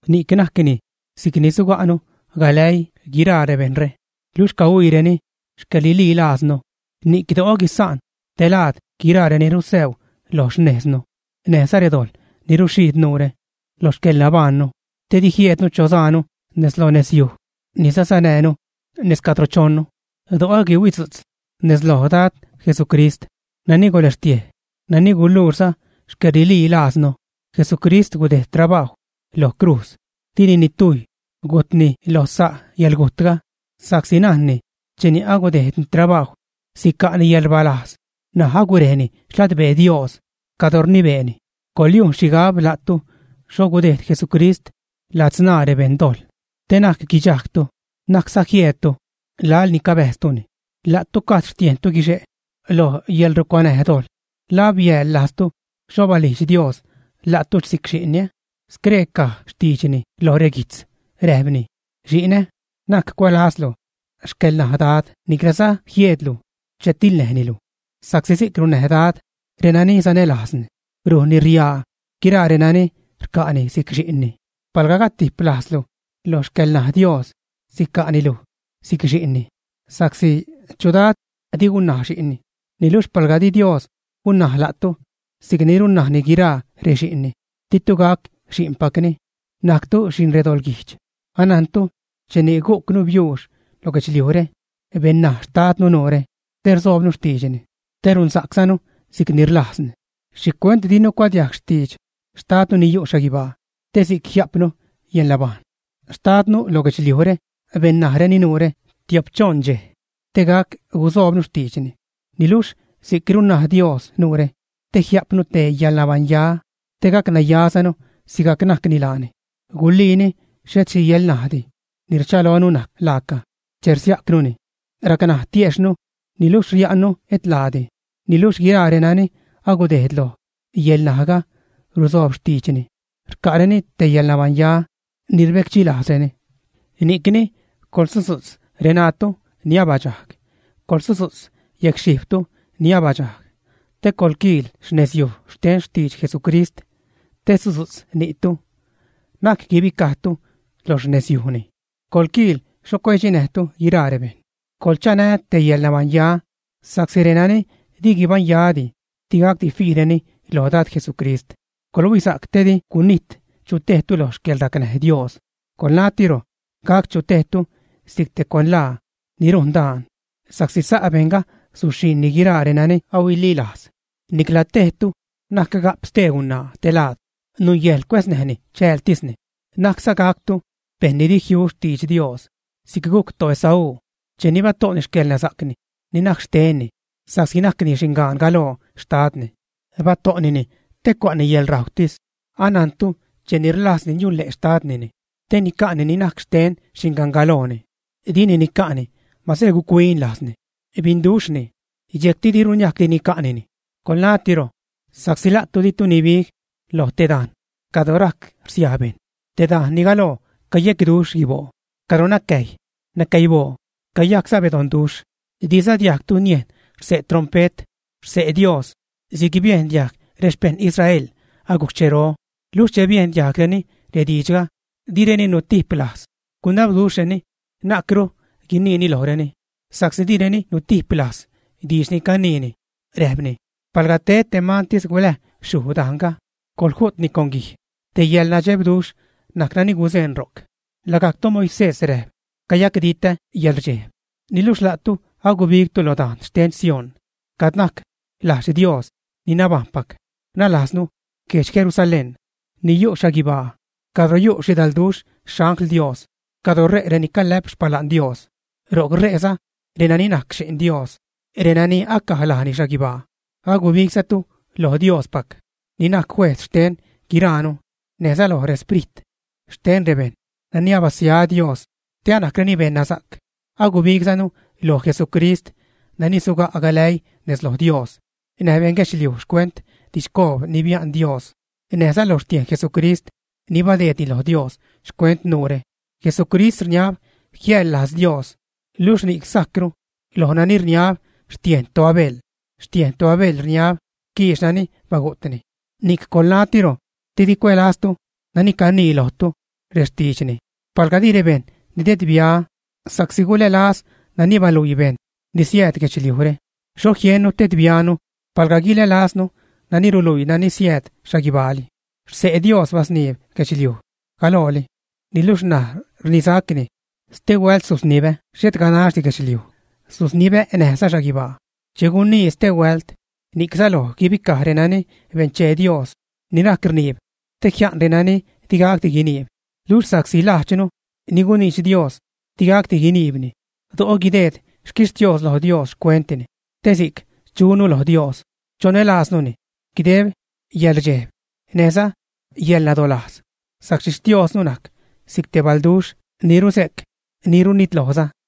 Ni'c najcni si'cni suga'nu galäii guiraa rebejṉre luxh cahuiireni xcäḻrililaaznu. Ni'c do'o guisa'n te laad guiraa reni rusäu lo xnejznu, näjza redojḻ ni ruxhiid nuure lo xcäḻnabajṉnu, te di jieednu chosaanu nez lo nezyuj ni sasanäänu nez cadro chonnu. Do'o guihuidzu'tz nez loj Dad Jesucrist nani guläxtiej, nani guluuxza xcäḻrililajznu. Jesucrist gudejd trabajw lo crujz, dini nitujy gujtni lo sa' yäḻgujtga, sa'csi najnni cheni agudejdni trabajw, sica'ni yäḻrbalajz; ṉaj agurejni xladbee Dios cadro rnibeeni. Coḻyujn xhigab la'tu xho gudejd Jesucrist ladzṉaa rebeṉ dojḻ, te na'c guidxajgtu, na'cza jieedtu laḻ ni cabäjztuni. La'tu gajd xtiejntu guixe' lo yäḻrucuanäj dojḻ. ¿La abiäḻ lajztu xho balijdx Dios la'tu si'c xi'nni, ä? Scree caj xtiidxni lo reguijtz; räjpni: Xinä, na'c cuälazlu xcäḻnaj Dad niclaza jieedlu che tiḻnäjni luj. Sa'csi si'c runnaj Dad renani sanälajzni, rujnni riaa guiraa renani rca'ni si'c xi'nni. Palga gatijp lajzlu lo xcäḻnaj Dios, sica'ni luj si'c xi'nni, sa'csi ¿chu dad di gunnaj xi'nni? Niluxh palga di Dios gunnaj la'tu si'cni runnajni guiraa rexi'nni, ditu gac xi'npacni, najctu xi'n redoḻguijdx. Anajntu cheni gucnu biuux lo guedxliujre, bennaj xtadnu nuure te rsoobnu xtiidxni, te runsa'czanu si'cni rlajzni. ¿Xhicuent dinu cuadiajg xtidx xtadnu ni yu' xhaguibaa te si'c jia'pnu yäḻnabajṉ, ä? Xtadnu lo guedxliujre bennajreni nuure tio'p-choṉ dxej, te gac gusoobnu xtiidxni. Niluxh si'c runnaj Dios nuure te jia'pnu te yäḻnabaṉya, te gac nayazanu sigajc najcni laani. Guliini xhet xhi yäḻnajdi ni rchalonu najc laaca che rsiajcnuni, racnaj tiejxhnu niluxh ria'nnu et laadi. Niluxh guiraa renani agudejd loj yäḻnajga rusoob xtiidxni, rca'reni te yäḻnabaṉya ni rbecdxilajzreni. Ni'cni coḻsudzu'tz reṉaatu ni abadxajg, coḻsudzu'tz yecxhijbtu ni abadxajg, te coḻquiil nezyuj xten xtidx Jesucrist te sudzu'tz ni'tu. Na'c guibicajtu lo xnezyujni. Coḻquiil xho cuedxinäjtu guiraa rebejṉ. Coḻchanä te yäḻnabaṉya, sa'csi renani di guibaṉyadi, digacdi fiireni loj Dad Jesucrist. Coḻhuisa'c te di gunijt chutejtu lo xcäḻracnäj Dios, coḻnatiro gac chu tejtu si'c te cuanlaa ni rujn daan, sa'csi sa' bejṉga suxhiṉni guiraa renani ahuililajz. Nicla tejtu na'c ga'p stee gunaa te laad, nungäjḻ cuäznäjni chäältisni. Na'cza gactu bejṉ ni di jiu xtidx Dios, si'c gujc toEsaú cheni bato'ni xcäḻnasa'cni ni najc xtenni sa'csi najcni xingan galoo xtadni. Bato'nini te cua'ni yäḻrajwtis. Anajntu, cheni rlajzni niunle' xtadnini te nica'ni ni najc xten xingangalooni, dini nica'ni mase guc-huin lajzni, binduxhni. Dxejcti diru niajcdi nica'nini. Coḻnatiro, sa'csi la'tu di'tu nibig lo te dajn cadro rajc rsiaj bejṉ, te dajn ni galoo cayecduxh guiboo, cadro nacäjy, nacäiboo, cayajcza bedonduxh. Diza diajgtu niejn xse' trompet, xse' Dios si'c biendiajg rexpejṉ Israel agujc xchero. Luxh che biejn diajgreni rediidxga, direni nutiplajz, gunabduxhreni na'cru guiniini lojreni. (Sa'csi direni nutiplajz diidx ni caniini, räjpni: “Palga ted te mantis guläj xhuj dajnga, coḻju'tni con guij.”) Te yäḻnadxebduxh najc nani guzeṉ ro'c, lagajc toMoisés räjp: “Cayacditä yäḻrdxejb.” Niluxh la'tu agubigtu lo dajn xten Sión, cad najc lajdx Dios ni nabajṉpac, nalajznu guedx Jerusalén ni yu' xhaguibaa cadro yu' xhidalduxh xangl Dios, cadro re' reni calä'p xpala'n Dios. Ro'c re'za reni najc xi'n Dios, renani acaj lajni xhaguibaa. Agubigzatu lo Diospac, ni najc Juejz xten guiraanu, näjza loj resprit xten rebejṉ nani abasia Dios te anajcreni beṉnasa'c. Agubigzanu loj Jesucrist nani suga' galäii nez loj Dios näj beṉguedxliuj xcuent didxcoob ni bia'n Dios, näjza lo xtiejn Jesucrist ni badeedni lo Dios xcuent nuure. Jesucrist rniab jiäjḻ lajz Dios, luxh ni'c sajcru loj nani rniab xtiejn toAbel. Xtiejn toAbel rniab quiix nani bagu'tni. Ni'c coḻnatiro te di cuälaztu nani canii lojtu rextiidxni. Palga di rebejṉ nidedbia sa'csi gulälaz nani baluii bejṉ ni siääd guedxliujre, ¿xho jiennu tedbianu palga guilälaznu nani ruluii nani siääd xhaguibaali? Xse' Dios basniib guedxliuj galooli, niluxh ṉaj rnisacni: “Ste huält susnibä xhet ganaxdi guedxliuj, susnibä näjza xhaguibaa.” Che gunii “ste huält”, ni'c säloj guibicaj renani benchee Dios ni rac rniib, te jia'n renani digacdi guiniib. Luxh sa'csi lajdxnu ni guniidx Dios digacdi guiniibni, do'o guideed xquixtios lo Dios xcuentni, te si'c chunu loj Dios, chonälaaznuni guideb yäḻrdxejb näjza yäḻnadolajz, sa'csi Xtiosnu najc si'c te balduxh ni ruse'c, ni runitlojza.